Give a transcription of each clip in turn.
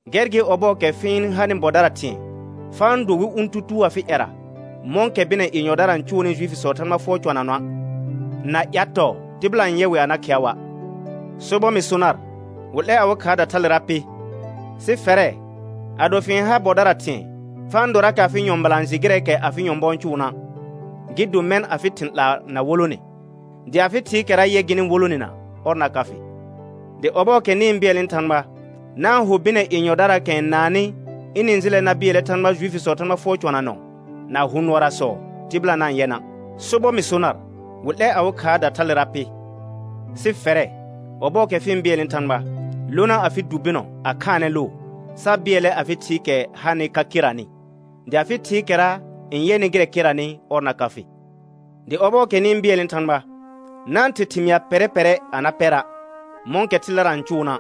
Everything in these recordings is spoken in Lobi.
Gɛr gɩ ɔbɔɔkɛ fɩ-n hanɩ bɔdara thɩ̃ɛ, fa-n do wɩ ʋ̃ tutuu afɩ ƴɛra, mɔ̃kɛ bɩnɛ yenyɔdara n cʋʋnɩ Juifisɔɔ Thãgba fʋɔr cɔnanɔa', na ƴatɔɔ tɩbɩla n yɛ wɩ a na khɩa wa'. Sobɔr mɩ so nar, wɩ 'lɛr awɩ khaarda thalera pɩ. Sɩ fɛrɛ̃, ado fɩ-n har bɔdara thɩ̃ɛ, fa-n dorakɛ afɩ nyɔ̃bɩlã n jɩ gɩrɛɛkɛ afɩ nyɔ̃bɔ n cʋʋna'; gɩ do mɛ̃ afɩ thɩ̃ 'laa na wolone, dɩ afɩ Thɩɩkɛra yɛ gɩnɩ wolonena ɔr na ka fɩ. Dɩ ɔbɔɔkɛ nɩ-n bɩɛlnɩ Thãgba, na-n ho bɩnɛ yenyɔdaraakɛ n naannɩ ɩnɩ-n jɩlɛ na bɩɛlnɛ Thãgba Juifisɔɔ Thãgba fʋɔr cɔnanɔ na hʋ nʋɔrasɔ tɩbɩla na-n yɛ na'. Sobɔr mɩ so nar, wɩ 'lɛr awɩ khaarda thalera pɩ. Sɩ fɛrɛ, ɔbɔɔkɛ fɩ-n bɩɛlnɩ Thãgba, lona afɩ du bɩnɔ a khaanɛ loo, sa bɩɛlnɛ afɩ Thɩɩkɛ hanɩ ka keranɩ; dɩ afɩ Thɩɩkɛra n yɛnɩ gɩrɛ keranɩ, ɔr na ka fɩ. Dɩ ɔbɔɔkɛ nɩ-n bɩɛlnɩ Thãgba, na-n ther thɩmɩa pɛrɛ pɛrɛ a na pɛra', mɔ̃kɛ thɩldara n cʋʋna',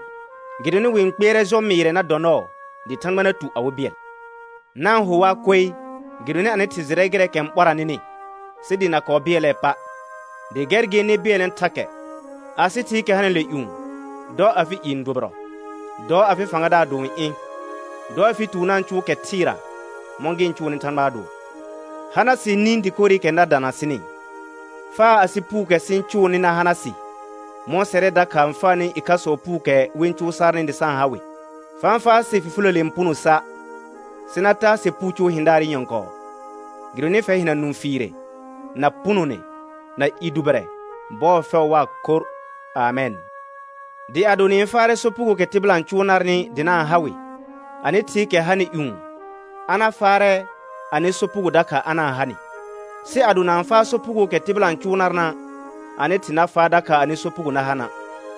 gɩdonɩ wɩ-n kpɩɛrɛ jɔ mɩɩrɛ na dɔ nɔɔ, dɩ Thãgba na tu awɩ bɩɛl. Na-n ho waa koe, gɩdonɩ anɩ Thɩ jɩrɛ gɩrɛɛkɛ n ɓɔra nɩnɩ, sɩ dɩ na kɔɔ bɩɛlɛɛ pa'. Dɩ gɛr gɩ nɩ bɩɛlnɛ thakɛ: Asɩ Thɩɩkɛ hanɩle ƴũ, dɔ afɩ i n dʋbɩrɔ; dɔ afɩ fãgadaar do n ɩ̃; dɔ afɩ tuur na-n cʋʋ kɛ thɩɩra, mɔ̃ gɩ-n cʋʋɩɩɩ Thãgbaa dʋɔ. Hana sɩ nĩ dɩkorɩkɛ na dana sɩnɩ. Faa asɩ puukɛ sɩ-n cʋʋnɩ na hana sɩ mɔ̃ sɛrɛ dakha n faanɩ ɩkhasɔɔ puukɛ wɩ-n cʋʋ sarnɩ dɩ sa-n ha wɩ. Fa-n faa sɩ fifiləle n puno sa', sɩ na taa sɩ puu cʋʋ hɩ̃daarɩ nyɔ̃kɔɔ. [Gɩdonɩ fɛr hɩna nũfiire, na punone, na i dʋbɩrɛ bɔɔ fɛʋ waa khorr. Amɛn.] Dɩ ado nɩ-n faarɛ sopugookɛ tɩbɩla n cʋʋ narnɩ dɩ na-n ha wɩ, anɩ Thɩɩkɛ hanɩ ƴũ a na faarɛ anɩ sopugo dakha a na-n ha nɩ. Sɩ ado na-n faa sopugookɛ tɩbɩla n cʋʋ narna', anɩ Thɩ na faa dakha anɩ sopugo na ha na'.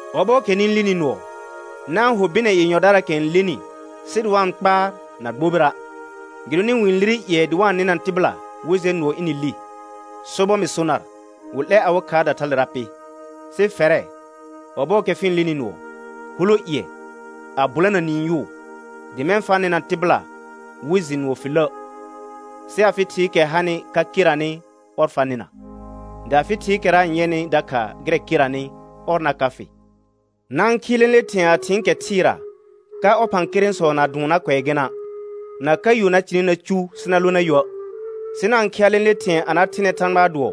Ɔbɔɔkɛ nɩ-n lin nʋɔ, na-n ho bɩnɛ yenyɔdaraakɛ n lenɩ sɩ dɩ wa-n kpaar na gbobira', gɩdonɩ wɩ-n lire ƴɩɛ dɩ wa-n nɩna tɩbɩla wɩ jɛ nʋɔ ɩnɩ li. Sobɔr mɩ so nar, wɩ 'lɛr awɩ khaarda thalera pɩ. Sɩ fɛrɛ, ɔbɔɔkɛ fɩ-n lini nʋɔ, hulo ƴɩƴ, a bʋlana niin yʋʋ; dɩ mɛ̃ fa nɩ̃na tɩbɩla wɩ jɩ nʋɔ fɩ lə', sɩ afɩ Thɩɩkɛ hanɩ ka keranɩ ɔr fa nɩna, dɩ afɩ Thɩɩkɛra n yɛnɩ dakha gɩrɛ keranɩ, ɔr na ka fɩ. Na-n khɩɩ lẽle thɩ̃ɛ a thɩɩn kɛ thɩɩra, ka ɔphãkerẽsɔ na dʋʋn na kʋɛ gɩna', na ka yo na cɩnɩ na cu sɩ na lõ na yuə'. Sɩ na-n khɩa lẽle thɩ̃ɛ a na thɩnɛ Thãgbaa dʋɔ,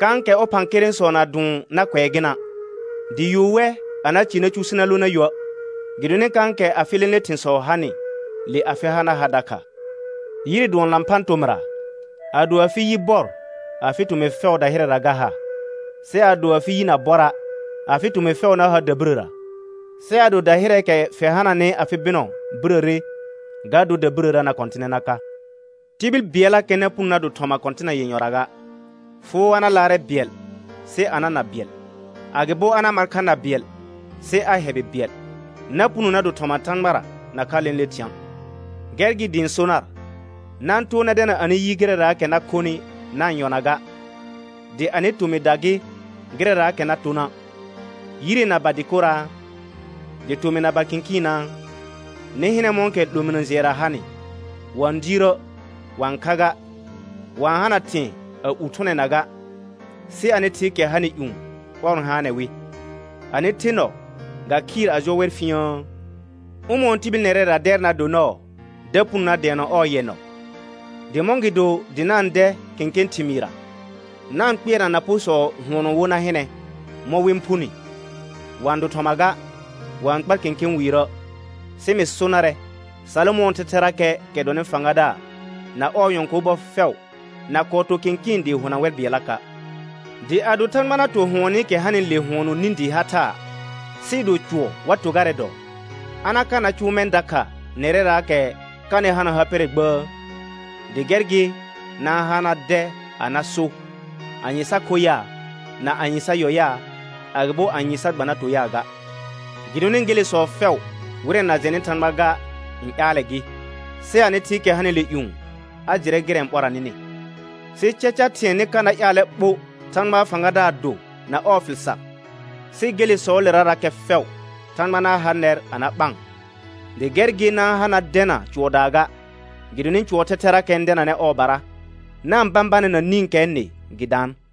kãkɛ ɔphãkerẽsɔ na dʋʋn na kʋɛ gɩna', dɩ yo wɛ a na cɩ na cu sɩ na lõ na yuə'. Gɩdonɩ kãkɛ afɩ lẽle thɩ̃sɔ hanɩ, le afɩ ha na ha dakha. Yire dʋɔn lãphã tormrra. Ado afɩ yi bɔr, afɩ tomɩ fɛʋ dahɩrɛra ga ha. Sɩ adõ afɩ yi na bɔra', afɩ tõmɩ fɛʋ na har dabɩrəra. Sɩ ado dahɩrɛɛkɛ fɩ hananɩ afɩ bɩnɔ birəre, ga dor dabirəra na kɔtɩnɛ na ka. Tibil bɩɛllakɛ na puno na do thɔma kɔ̃tɩna yenyɔra ga, foo a na laarɛ bɩɛl sɩ a na na bɩɛl, agɩbo a na mar kha an bɩɛl sɩ a hɛbɩ bɩɛl. Na puno na do thɔma Thãgbara nakha lẽle thɩ̃a'. Gɛr gɩ dɩ ɩ̃ so nar: Na-n too na dɛna anɩ yi gɩrɛraakɛ na khonɩ na-n yɔna ga, dɩ anɩ tomɩda gɩ gɩrɛraakɛ na tona'. Yire na ba dɩkoraa? Dɩ tomɩr na ba kɩ̃kɩɩnaa? Nɩ hɩnɛ mɔ̃kɛ 'lominə jɩɛra hanɩ. Wa-n diirə', wa-n kha ga, wa-n hana thɩ̃ɛ a ur thʋnɛna ga, sɩ anɩ Thɩɩkɛ hanɩ ƴũ, ɔr n haanɛ wɩ. Anɩ the nɔ ga khɩɩr a jɔ wɛr fĩiəə? Ʋmɔ̃ɔ tibil nɛrɛra dɛr na do nɔɔ da puno na dɛɛnɔ ɔɔ yɛ nɔ? Dɩ mɔ̃gɩdo dɩ na-n dɛ kẽkẽ thɩmɩɩrra? Na-n kpɩɛrna naporsɔ hʋɔnɔ wo na hɩnɛ mɔ̃ wɩ-n phuni. Wa-n do thɔma ga, wa-n kpar kẽkẽ wiirə'. Sɩ mɩ so narɛ Salomɔ̃ɔ thɛthɛrakɛ, kɛ dɔnɩ fãgadaar, na ɔɔ nyɔ̃kor bɔ fɛʋ na kɔɔ to kɩ̃kɩɩn dɩɩ hona wɛr bɩɛllaka'. Dɩ ado Thãgba na to hʋɔnɩkɛ hanɩle hʋɔnɔ nĩ dɩɩ ha thaa, sɩɩ do cʋɔ wa to garɛ dɔɔ, a na ka na cʋʋ mɛ̃ dakha nɛrɛraakɛ kanɩ hana ha pɛrɛ gbəə? Dɩ gɛr gɩ na-n ha na dɛ a na so: Anye sa kho yaa, na anye sa yɔ yaa, agɩbo anye sa gba na to yaa ga. Gɩdonɩ gelesɔ fɛʋ wɩrɛ na jɛnɩ Thãgba ga n ƴaalɛ gɩ. Sɩ anɩ Thɩɩkɛ hanɩle ƴũ, a jɩrɛ gɩrɛ n ɓɔra nɩnɩ. Sɩ caca thɩ̃ɛ nɩ ka na ƴaalɛ ɓo Thãgbaa fãgadaar do na ɔɔ fɩl sar, sɩ gelesɔɔlerarakɛ fɛʋ Thãgba na ha nɛr a na ɓaan. Dɩ gɛr gɩ na-n ha na dɛna cʋɔdaa ga, gɩdonɩ cʋɔɔ thɛthɛrakɛ n dɛnanɛ ɔɔbara. Na-n bãbanɛ na nĩkɛɛ nɩ, gɩ daan.